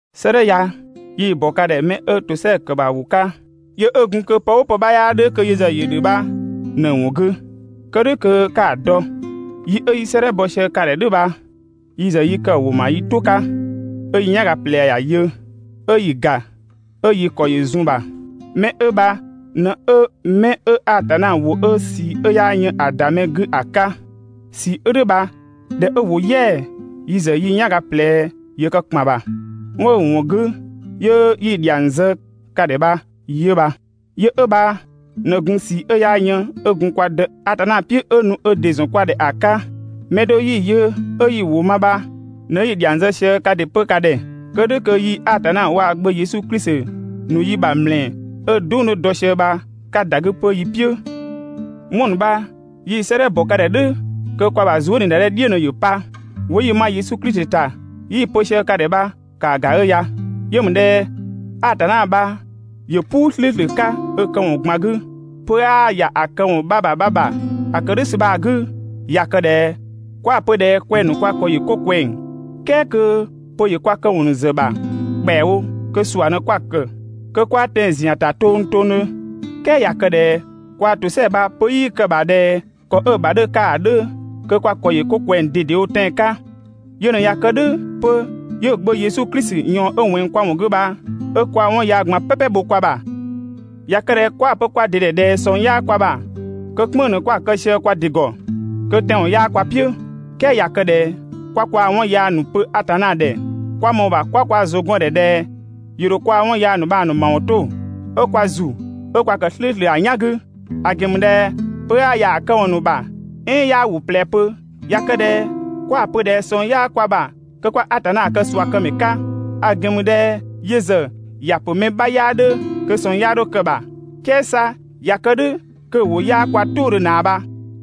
'Sëëdhɛ ya yi‑ ‑bɔ ka ‑dhɛ 'mɛ 'ö ‑tosɛa ‑kë ‑bha ‑wʋ 'ka, yö 'ö gun kö pë "ʋʋ pë 'bha 'yaa 'dhö kö yö ‑zë ‑yö ‑dhö bha ꞊në‑ ‑wɔn 'gü, Kë "dhʋ̈ kö 'ka‑ dɔ. Yi 'ö 'yi 'sëëdhɛ bɔ sië ka ‑dhɛ "dhʋ̈ bha yi ‑zë yi kë‑ ‑wʋ ‑ma yi "tʋ 'ka, 'ö yi "yanga ꞊plɛ ‑ya yö, 'ö 'yi‑ ‑ga, 'ö yi ‑kɔ ‑yö zun‑ ‑bha. 'Mɛ 'ö bha ꞊në 'ö 'mɛ 'ö Atanna ‑wʋ 'ö ꞊sii 'ö 'yaa yën ‑a ‑da mɛ 'gü ‑a 'ka. ꞊Sii 'ö "dhʋ̈ bha ꞊dhɛ 'ö ‑wo "yɛa‑, yi ‑zë yi "yanga ꞊plɛ ‑yö kë ‑kpan ‑bha, 'wɔn 'ö‑ ‑wɔn 'gü 'yö 'yi‑ ‑dhiang zë ka ‑dhɛ bha 'yö bha. Yö 'ö bha ꞊në gun ꞊sii 'ö 'yaa yën 'ö gun kwa Dë Atanna "piʋ̈ 'ö nu ö ‑dɩ ‑zɔn kwa ‑dhɛ ‑a 'ka. Mɛ do 'yi‑ yö 'ö 'yi‑ ‑wʋ ma bha ꞊në 'yi‑ ‑dhiang zë sië kaa ‑dɩ 'pö ka ‑dhɛ, kë "dhʋ̈ kö yii‑ Atanna waa‑ Gbö Yesu Klisi ‑nu yi ‑bha ‑mlɛɛ 'ö‑ "dʋng 'dhö dɔ sië bha 'ka ‑da 'gü 'pö yi "piʋ̈. 'Wɔn ‑nu bha yi‑ 'sëëdhɛ ‑bɔ ka ‑dhɛ "dhʋ̈ kö kwa ‑bha zuëniidadhe "dhiʋ̈ ꞊në ‑yö pa. ‑Wʋ 'yi‑ ma Yesu Klisi ‑ta 'yi‑ pö sië ka ‑dhɛ bha ‑kaa ‑ga 'ö ya. Yö ‑mü ꞊dhɛ Atanna bha ‑yö "puu "slʋ̈ʋ̈slʋ̈ 'ka ö këwɔn ꞊gban 'gü, pö 'aa ‑ya këwɔn 'bha ‑bha 'bha ‑bha. ‑A kë "dhʋ̈ ‑sü bha‑ 'gü, ꞊ya kë ꞊dhɛ 'kwa‑ pö ꞊dhɛ kwɛng‑ ‑nu kwa ‑kɔ ‑yö 'ko ꞊kwɛng "kɛɛ kö pö ‑yö kwa këwɔn ‑nu ‑zë ‑bha ‑kpɛawo, kö ꞊sua ‑në 'kwa‑ ‑kë. Kö 'kwaa tɛan‑ ‑zian ‑ta tongtongdhö. "Kɛɛ ꞊ya kë ꞊dhɛ kwaa‑ ‑tosɛa bha pö 'yii kë‑ ‑bha ꞊dhɛ ‑kɔ 'ö‑ ‑bha 'dhö‑ 'ka ‑a 'dhö, kö kwa ‑kɔ ‑yö 'ko ꞊kwɛng ꞊dedewo tɛan‑ 'ka. Yö ꞊në ꞊ya kë "dhʋ̈ 'pö 'yö‑ Gbö Yesu Klisi ꞊yɔɔn 'ö ꞊wɛnng kwa ‑wɔn 'gü bha 'ö kwaa‑ 'wɔn yaa ꞊gban "pɛpɛ bho kwa ‑bha. ꞊Ya kë ꞊dhɛ 'kwa‑ pö kwa ‑dɩ ‑dhɛ ꞊dhɛ ꞊sɔng 'yaa kwa ‑bha, kö "kpënng‑ ꞊në 'kwa‑ kë sië kwa ‑dɩ ‑gɔ. Kö tɛanwɔn 'yaa kwa "piʋ̈. "Kɛɛ ꞊ya kë ꞊dhɛ 'kwa kwaa‑ 'wɔn yaa ‑nu pö Atanna ‑dhɛ, kwa ‑mɔɔ ‑bha 'kwa kwa ‑zʋ gɔn‑ ‑dhɛ ꞊dhɛ ‑yö ‑dho kwaa‑ 'wɔn yaa ‑nu bha‑ ‑nu ‑mawɔn 'to, 'ö kwa ‑zu 'ö kwa ‑kë "slʋ̈ʋ̈slʋ̈ ‑a "yan 'gü. ‑A ‑gɛn ‑mü ꞊dhɛ pö 'aa ‑ya ‑a këwɔn ‑nu ‑bha, "ɛɛn 'yaa ‑wʋ ꞊plɛ 'pö. ꞊Ya kë ꞊dhɛ 'kwa‑ pö ꞊dhɛ ꞊sɔng 'yaa kwa ‑bha, kö 'kwa Atanna kë ꞊suakëmɛ 'ka, ‑a ‑gɛn ‑mü ꞊dhɛ yö ‑zë ‑ya ‑pö mɛ 'bha 'yaa 'dhö kö ꞊sɔng 'ya 'dho kë‑ ‑bha "kɛɛ 'sa ꞊ya kë "dhʋ̈ kö‑ ‑wʋ 'yaa kwa "tʋʋdhö ꞊naa bha.